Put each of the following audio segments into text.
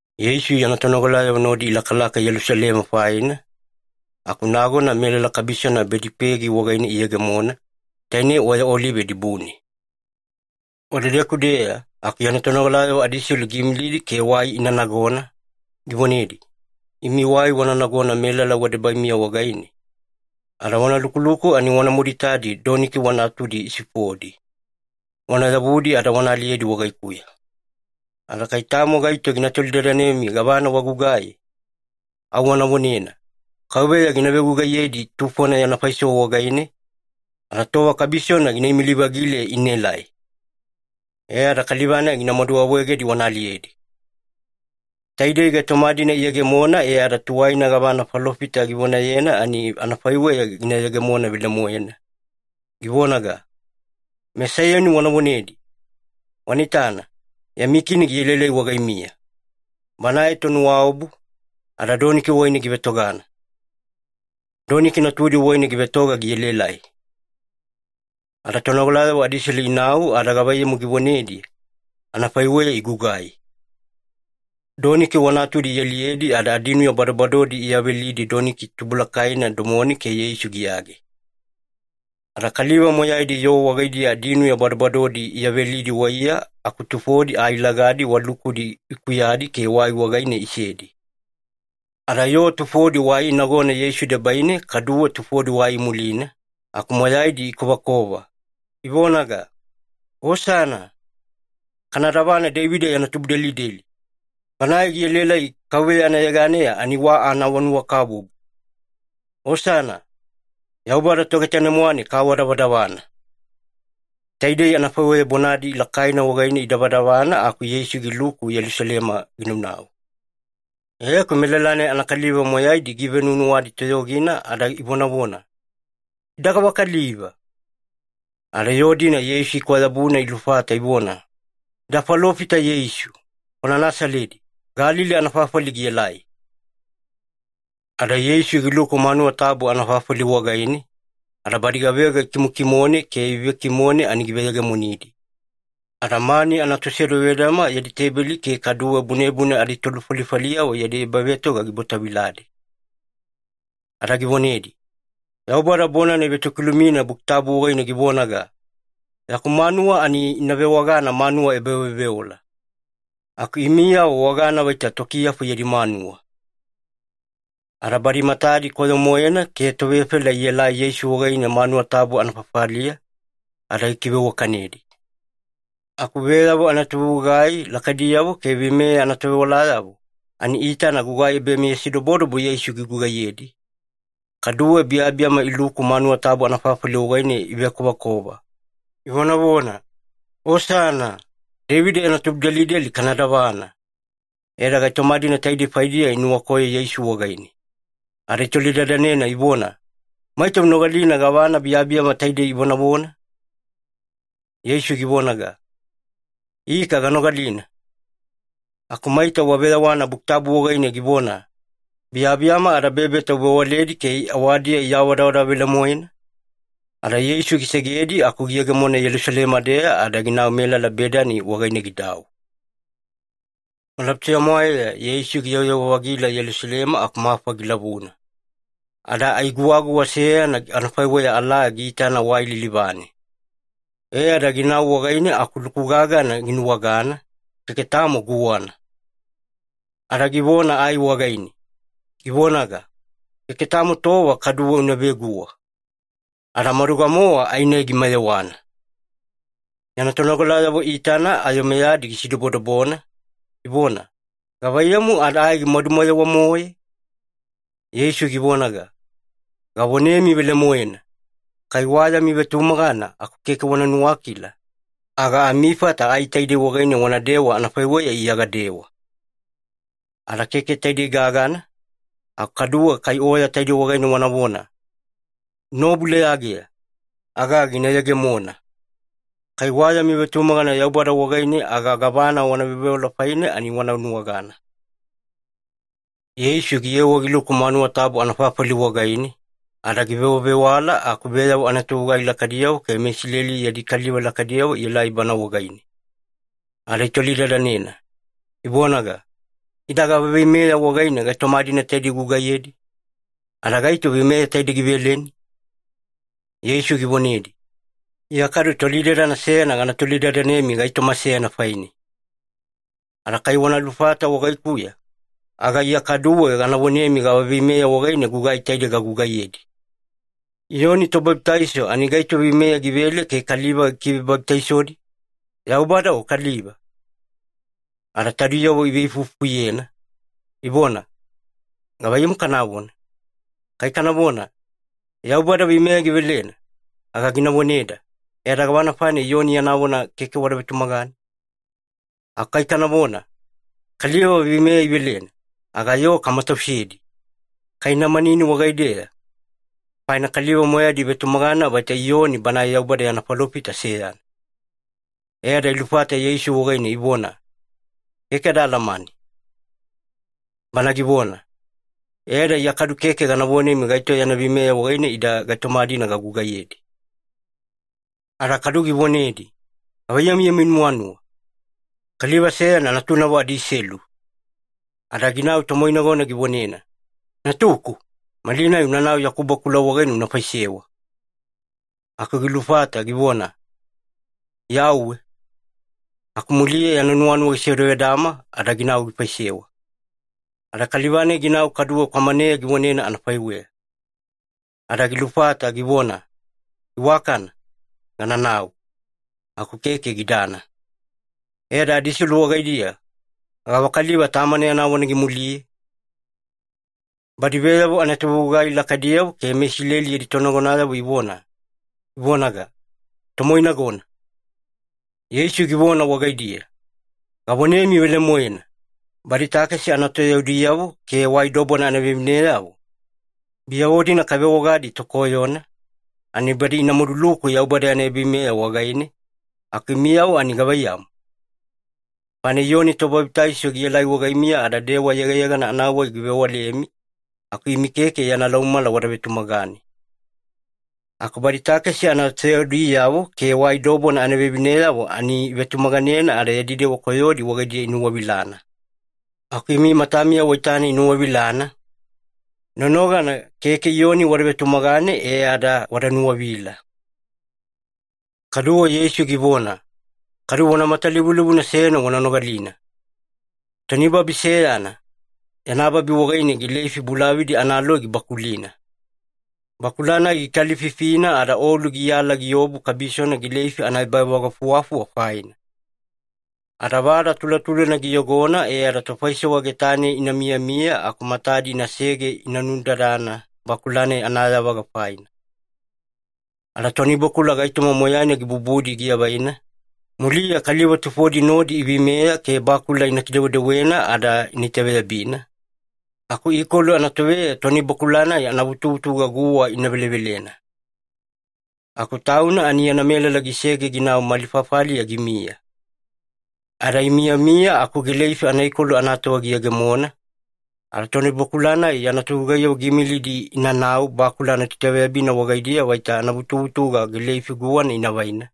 Yeisu yana tonogalayavo nodi ilakalaka Yelusalema faina, aku nagona melala kabisona Bedipegi wagaine iyegemona, tainei Oya Olive dibune. Wadedeku-deya, aku yana tonogalayavo adiselu giimilidi ke wai ina nagona, givonedi, “Imi wai wana nagona melala wadebaimiya wagaine, ada wana lukuluku ani wanamadu itadi doniki wa natudi isifodi. Wana yavudi ada wana aliyedi wagaikuya. Ada kai tamo gaito gina tolidadanemi gavana wagugai, au wana vonena, ‘Kauveya gina vegugaiyedi tufona yana faisewa wagaine, ada tova kabisona gina imili-vagile inaelai.’ E ada kaliva-nai ginamadu awaegedi wana aliyedi.” Taidei gaitoma-dina iyegemona e ada tuwaina gavana falofita givonayena, ani anafaiweya gina yegemona velemoena, givonaga, “MeSaiyoni wana vonedi, ‘Wana itana, yami Kini gielaelai wagaimiya. Banae tonuwaobu, ada doniki wagaine givetogana. Doniki natudi wagaine givetoga gielaelai.’” Ada tonogalayavo adiselu inau ada gavaiyamu givonedi, anafaiweya igugai. Doniki wa natudi ialiyedi ada adinuya badobadodi iyavelidi doniki tubulakaina domone ke Yeisu giyage. Ada kaliva moyaidi yoo wagaidiya adinuya badobadodi iyavelidi waiya, aku tufodi ai lagadi wa lukudi ikuyadi ke wai wagaine isedi. Ada yoo tufodi wai inagona Yeisu debaine kaduwe tufodi wai imulina, aku moyaidi ikovakova, ivonaga, “Osana! Kana davana Deivida yana tubudelideli! Banae gielaelai KAUVEYA anayeganeya ani wa anaawanuwakabubu! Osana! Yaubada Togetanemwane kaawadavadavana!” Taidei anafaiweya bonadi lakaina wagaine idavadavana aku Yeisu giluku Yelusalema ginaunau. E aku melala-nai anakaliva moyaidi giivenuwanuwadi toyogina ada ivonavona, “Ida gavakaliva?” Ada yoo-dina Yeisu ikwayabuna ilufata ivona, “Ida falofita Yeisu, kwana Nasaledi, Galili anafafali gielai.” Ada Yeisu giluku manuwa tabu anafafali wagaine, ada badi gavega ikimokimone ke ivevekimone ani giveyegemonidi. Ada mani anatosevedavedama yadi teibeli ke kaduwe bunebune aditolufalifaliyavo yadi ebavetoga gibwataviladi. Ada givonedi, “Yaubada bonana ivetokilumina Buki Tabu wagaine givonaga, ‘Yaku manuwa ani ina vewagana manuwa ebaveoveola.’ Aku imiyavo wagana vaita tokiyafu yadi manuwa.” Ada badi matadi koyo-moena ke tovefela ielai Yeisu wagaine manuwa tabu anafafaliya, ada gikiveiwakanedi. Aku veyavo anatovegugai lakaidiyavo ke veimeya anatovewalayavo, ani iitana gugai ebameyasidobodobo Yeisu gigugaiyedi, kaduwe biyabiyama iluku manuwa tabu anafafali wagaine ivekovakova, ivonavona, “Osana! Deivida yana tubudelideli kana davana!” E ada gaitoma-dina taidei faidiya inuwakoyo Yeisu wagaine. Ada itolidadanena ivona, “Maita unogalina gavana biyabiyama taidei ivonavona?” Yeisu givonaga, “Ika ganogalina. Aku maita waveyawana Buki Tabu wagaine givona, ‘Biyabiyama ada bebeta uvewaledi ke awadiya iawadavadava velemoena’?” Ada Yeisu gisegedi aku giyegemona Yelusalema-deya ada ginau melala Bedani wagaine gidau. Malabutuya-mwaeya Yeisu giyewayewa-vagila Yelusalema aku mafa gilavuna. Ada ai guwaguwa seyana anafaiweya alaa giitana wai lilivane. E ada ginau wagaine aku luku gagana ginuwagana, keke tamo guwana. Ada givona ai wagaine, givonaga, “Keke tamo tova kaduwe una veguwa.” Ada maduga-mowa ai-nai gimayewana. Yana tonogalayavo iitana ayo meyadi gisidobodobona, ivona, “Gavaiyamu ada ai gimadumayewa-moe?” Yeisu givonaga, “Gavonemi velemoena, kai wa yami vetumagana aku keke wana nuwakila, aga amifata ai taidei wagaine wanadewa anafaiweya Iya gadewa. Ada keke taidei gagana, aku kaduwe kai oya taidei wagaine wanavona, ‘Unaobu leyageya,’ aga gina yegemona. Kai wa yami vetumagana Yaubada wagaine, aga gavana wana veoveola faine ani wana nuwagana.” Yeisu giyewa giluku manuwa tabu anafafali wagaine, ada givewavewala aku veyavo anatovegugai lakaidiyavo ke meIsileli yadi kaliva lakaidiyavo ielai Bana wagaine. Ada itolidadanena, ivonaga, “Ida gava veimeya wagaine gaitoma-dina taidei ugugaiyedi? Ada gaito veimeya taidei giveleni?” Yeisu givonedi, “Iya kadu tolidadana seyana gana tolidadanemi gaitoma seyana faine. Ada kai wana lufata wagaikuya, aga Iya kaduwe gana vonemi gava veimeya wagaine gugai taidei gagugaiyedi. Iyoni Tobabitaiso ani gaito veimeya givele ke kaliva gikivebabitaisodi? Yaubada o kaliva?” Ada taudiyavo iveifuifufuyena, ivona, “Gavaiyamu kanavona? Kai kanavona, ‘Yaubada veimeya givelena,’ aga gina voneda, ‘E ada gavana faina Iyoni yana vona keke wada vetumagane?’ Aku kai kanavona, ‘Kaliva veimeya ivelena,’ aga yoo kamatausedi, kai ina manini wagaideya, faina kaliva moyaidi ivetumagana vaita Iyoni banae Yaubada yana falofita seyana.” E ada ilufata Yeisu wagaine ivona, “Keke ada alamane.” Bana givona, “E ada Iya kadu keke gana vonemi gaito yana veimeya wagaine ida gaitoma-dina gagugaiyedi.” Ada kadu givonedi, “Gavaiyamu yami nuwanuwa? Kaliva seyana natunavo adiselu. Ada ginau tomoinagona givonena, ‘Natuku, malinai unanau yaku bakula wagaine una faisewa.’ “Aku gilufata givona, ‘Iya auwe.’ Aku muliya yana nuwanuwa gisevedavedama ada ginau gifaisewa. “Ada kaliva-nai ginau kaduwe kwamaneya givonena anafaiweya. Ada gilufata givona, ‘Iwakana. Gananau.’ Aku keke gidana. E ada adiselu wagaidiya, gavakaliva tamana yana vona gimuliye?” Badi veyavo anatovegugai lakaidiyavo ke meIsileli aditonagonayavo ivona, ivonaga, “Tomoinagona.” Yeisu givona wagaidiya, “Gavonemi velemoena, badi takesi anatoyaudiyavo ke wai dobona anavevineyavo, biyavo-dina kavewagadi tokoyona, ani badi ina maduluku Yaubada yana ebaveimeya wagaine, aku imiyavo ani gavaiyamu? Faina Iyoni Tobabitaiso gielai wagaimiya ada dewa yegayegana anawai givewalemi, aku imi keke yana laumamala wada vetumagane. Aku badi takesi anatoyaudiyavo ke wai dobona anavevineyavo ani ivetumaganena ada yadi dewa koyodi wagaidiya inuwavilana. Aku imi matamiya waitana inuwavilana, nonogana keke Iyoni wada vetumagane e ada wada nuwavila.” Kaduwe Yeisu givona, “Kadu vona matalivulivuna seyana wana nogalina. Toni babi seyana, yana babi wagaine gileifi bulavadi analoi gibakulina. Bakula-nai gikalififina ada olu giyala giobu kabisona gileifi anaebavagafuwafuwa faina. Ada vada tulatulana giyogona e ada tofaisewa getane ina miyamiya aku matadi inasege ina nudadana bakula-nai anayavaga faina. Ada toni bakula gaitoma moyaina gibubudi giavaina, muliya kaliva tufodi nodi iveimeya ke bakula ina kidewedewena ada ina itaveyabina, aku ikolu anatoveya toni bakula-nai anavutuvutuga guwa ina velevelena. Aku tauna ani yana melala gisege ginau mali fafaliya gimiya. Ada imiyamiya aku gileifi anaikolu anatova giyegemona, ada tonibakula-nai yana togugaiyavo giimilidi inanau bakula anatoitaveyabina wagaidiya vaita anavutuvutuga gileifi guwana ina vaina,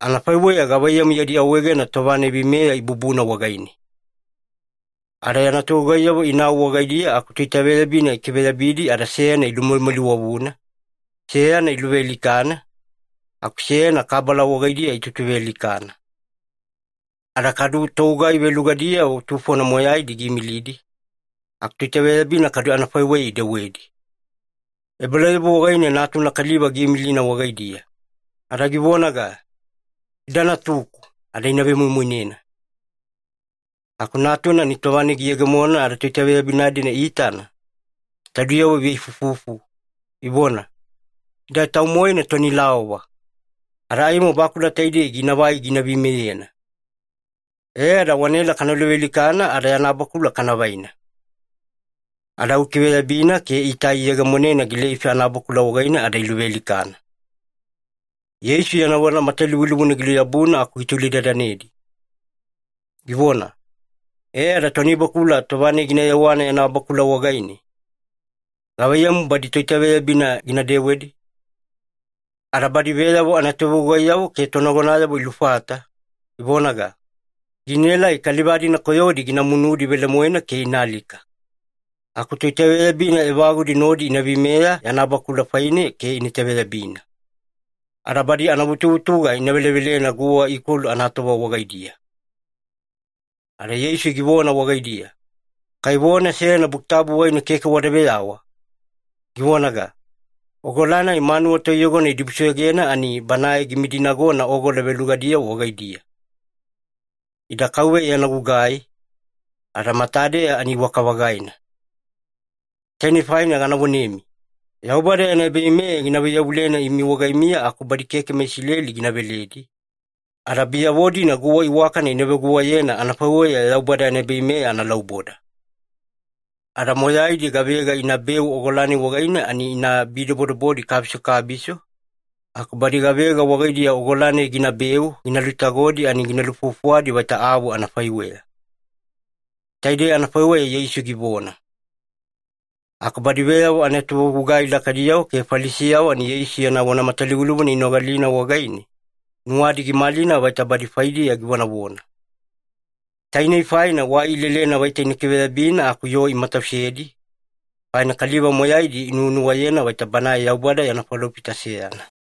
anafaiweya gavaiyamu yadi awaegena tova-nai veimeya ibubuna wagaine. Ada yana togugaiyavo inau wagaidiya aku toitaveyabina ikiveyabidi ada seyana ilumalimaliwavuna, seyana iluvealikana, aku seyana kabala wagaidiya itutuvealikana. Ada kadu togugai velugadiyavo tufona moyaidi giimilidi, aku toitaveyabina kadu anafaiweya idewedi. Ebalauyabu wagaine natuna kaliva giimilina wagaidiya. Ada givonaga, ‘Ida natuku, ada ina vemoimoinena.’ “Aku natuna ani tova-nai giyegemona ada toitaveyabina-dina iitana, taudiyavo iveifuifufu, ivona, ‘Ida tau-moena toni laova. Ada aimo bakula taidei ginavai gina veimeyena. E ada wanaela kana luvealikana ada yana bakula kana vaina.’ Ada au ikiveyabina ke itai iyegemonena gileifi anabakula wagaine ada iluvealikana.” Yeisu yana vona matalivulivuna giluyabuna aku gitolidadanedi, givona, “E ada tonibakula tova-nai gina yewana yana bakula wagaine, gavaiyamu badi toitaveyabina gina dewedi?” Ada badi veyavo anatovegugaiyavo ke tonagonayavo ilufata, ivonaga, “Ginaelai kaliva-dina koyodi gina munudi velemoena ke ina alika. Aku toitaveyabina evagudi nodi ina veimeya yana bakula faine ke ina itaveyabina, ada badi anavutuvutuga ina velevelena guwa ikolu anatova wagaidiya.” Ada Yeisu givona wagaidiya, “Kai vona seyana Buki Tabu wagaine keke wada veyawa, givonaga, ‘Ogola-nai manuwa toiyogona idibusoyogena ani banae gimidinagona ogola velugadiyavo wagaidiya. Ida KAUVEYA yana gugai, ada matadeya ani iwaka-vagaina.’ “Tainei faina gana vonemi, Yaubada yana ebaveimeya gina vaiyavulena imi wagaimiya aku badi keke meIsileli gina veledi, ada biyavo-dina guwa iwakana ina veguwayena anafaiweya Yaubada yana ebaveimeya analauboda. Ada moyaidi gavega inabeu ogola-nai wagaine ani ina bidobodobodi kabiso kabiso, aku badi gavega wagaidiya ogola-nai ginabeu gina lutagodi ani gina lufuwafuwadi vaita avu anafaiweya.” Taidei anafaiweya Yeisu givona. Aku badi veyavo anatovegugai lakaidiyavo ke Falisiyavo ani Yeisu yana vona matalivulivuna inogalina wagaine, nuwadi gimalina vaita badi faidiya givonavona. Tainei faina wai ilelena vaita ina kiveyabina aku yoo imatausedi, faina kaliva moyaidi inuwanuwayena vaita Banae Yaubada yana falofita seyana.